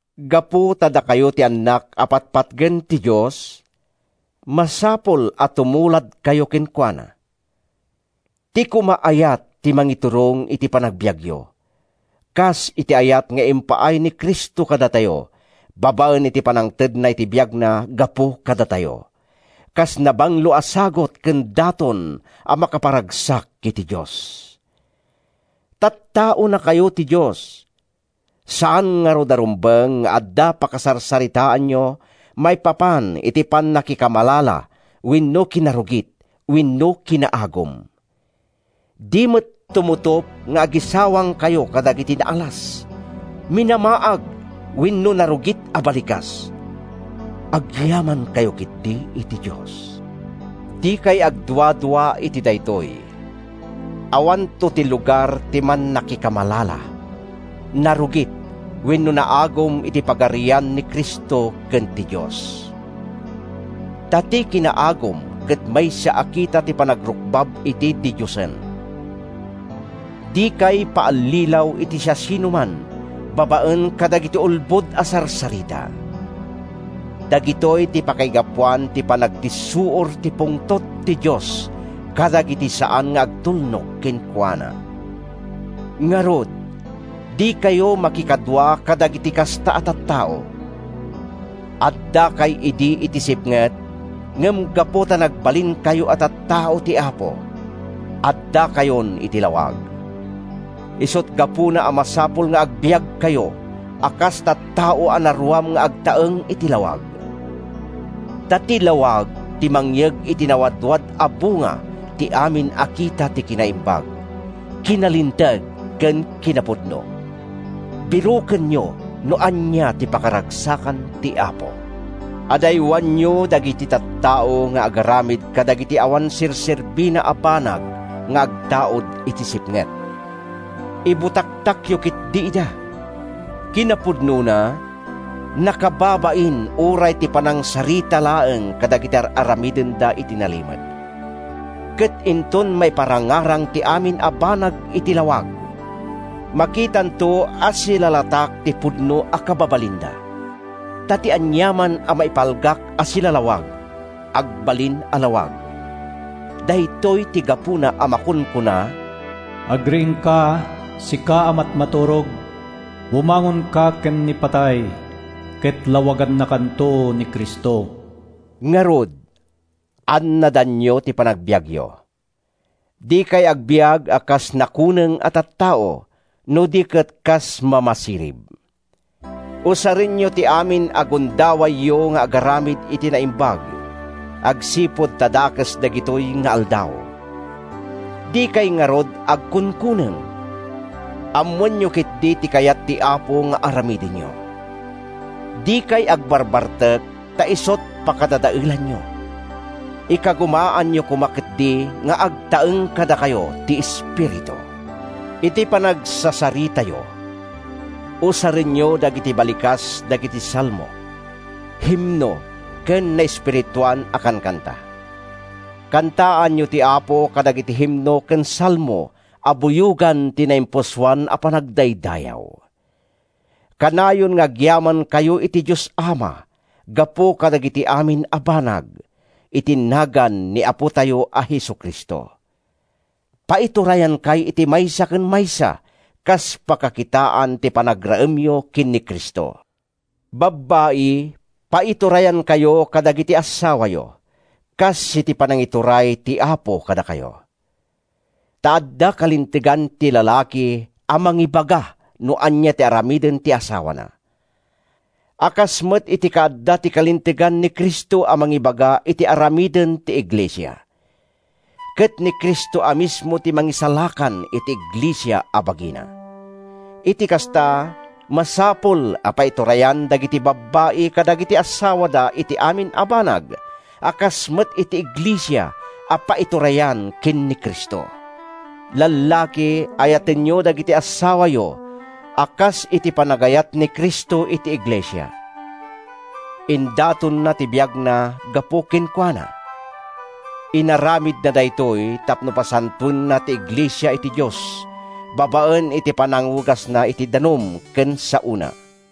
Gapu ta dakayo ti annak a patpatgen ti Dios, masapul a tumuladkayo kenkuana. Ti koma ayat ti mangiturong iti panagbiagyo, kas iti ayat nga impaay ni Cristo kadatayo babaen iti pannangtedna iti biagna gapu kadatayo, kas nabanglo a sagut ken daton a makaparagsak iti Dios. Tattaonakayo ti Dios. Saan ngarud a rumbeng nga adda pakasarsaritaanyo maipapan iti pannakikamalala wenno kinarugit wenno kinaagum. Di met tumutop nga agisawangkayo kadagiti naalas, minamaag wenno narugit a balikas. Agyamankayo ketdi iti Dios. Dikay agduadua iti daytoy: Awanto ti lugar ti mannakikamalala, narugit wenno naagum iti pagarian ni Cristo ken ti Dios. (Ta ti kinaagum ket maysa a kita ti panagrukbab iti didiosen.) Dikay paallilaw iti siasinoman babaen kadagiti ulbod a sarsarita. Dagitoy ti pakaigapuan ti panagdissuor ti pungtot ti Dios kadagiti saan nga agtulnog kenkuana. Ngarud, dikayo makikadua kadagiti kasta a tattao. Addakay idi iti sipnget, ngem gapu ta nagbalinkayon a tattao ti Apo, addakayon iti lawag. Isut’ gapuna a masapul nga agbiagkayo a kas tattao a naruam nga agtaeng iti lawag. Ta ti lawag ti mangyeg iti nawadwad a bunga ti amin a kita ti kinaimbag, kinalinteg ken kinapudno. Birokenyo no ania ti pakaragsakan ti Apo. Adaywanyo dagiti tattao nga agaramid kadagiti awan serserbina a banag nga agtaud iti sipnget. Ibutaktakyo ketdi ida. ( Kinapudnona, nakababain uray ti panangsarita laeng kadagiti ar-aramidenda iti nalimed.) Ket inton maiparangarang ti amin a banag iti lawag, makitanto a silalatak ti pudno a kababalinda. Ta ti aniaman a maipalgak a silalawag agbalin a lawag. Daytoy ti gapuna a makunkuna, “Agriingka, sika a matmaturog, Bumangonka ken ni patay! Ket lawagannakanto ni Cristo.” Ngarud, annadanyo ti panagbiagyo. Dikay agbiag a kas nakuneng a tattao, no di ket kas mamasirib. Usarenyo ti amin a gundawayyo nga agaramid iti naimbag agsipud ta dakes dagitoy nga aldaw. Dikay ngarud agkunkuneng. Ammoenyo ketdi ti kayat ti Apo nga aramidenyo. Dikay agbarbartek ta isut’ pakadadaelanyo. Ikagumaanyo koma ketdi nga agtaeng kadakayo ti Espiritu. Iti panagsasaritayo, usarenyo dagiti balikas dagiti salmo, himno ken naespirituan a kankanta. Kantaanyo ti Apo kadagiti himno ken salmo a buyogan ti naimpusoan a panagdaydayaw. Kanayon nga agyamankayo iti Dios Ama gapu kadagiti amin a banag, iti nagan ni Apotayo a Jesu-Cristo. Paiturayankay iti maysa ken maysa kas pakakitaan iti panagraemyo ken ni Cristo. Babbai, paiturayankayo kadagiti assawayo, kas iti panangituray ti Apo kadakayo. Ta adda kalintegan ti lalaki a mangibaga no ania ti aramiden ti asawana, a kas met iti kaadda ti kalintegan ni Cristo a mangibaga iti aramiden ti iglesia. Ket ni Cristo a mismo ti Mangisalakan iti iglesia a bagina. Iti kasta, masapul a paiturayan dagiti babbai kadagiti assawada iti amin a banag, a kas met iti iglesia a paiturayan ken ni Cristo. Lallaki, ayatenyo dagiti assawayo a kas iti panagayat ni Cristo iti iglesia. Indatonna ti biagna gapu kenkuana. Inaramidna daytoy tapno pasantoenna ti iglesia iti Dios babaen iti panangugasna iti danum ken saona,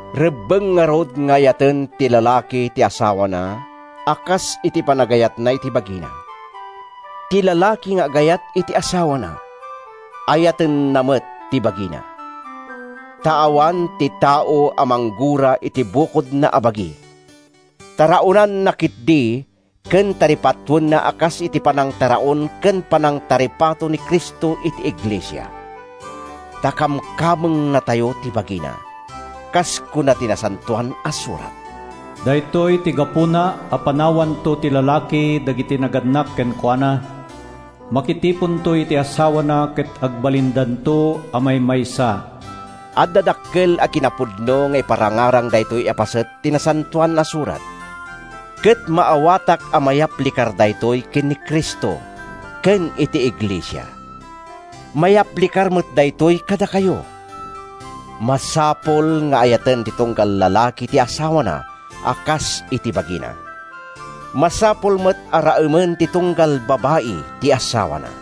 Rebbeng ngarud nga ayaten ti lalaki ti asawana a kas iti panagayatna iti bagina. Ti lalaki nga agayat iti asawana, ayatenna met ti bagina. ( Ta awan ti tao a manggura iti bukodna a bagi. Taraonanna ketdi ken taripatoenna a kas iti panangtaraon ken panangtaripato ni Cristo iti iglesia. Ta kamkamengnatayo ti bagina.) Kas kuna ti Nasantoan a Surat, “Daytoy ti gapuna a panawanto ti lalaki dagiti nagannak kenkuana. Makitiponto iti asawana ket agbalindanto a maymaysa.” Adda dakkel a kinapudno nga iparangarang daytoy a paset ti Nasantoan a Surat, ket maawatak a mayaplikar daytoy ken ni Cristo ken iti iglesia. Mayaplikar met daytoy kadakayo. Masapul nga ayaten ti tunggal lalaki ti asawana a kas iti bagina. Masapul met a raemen ti tunggal babai ti asawana.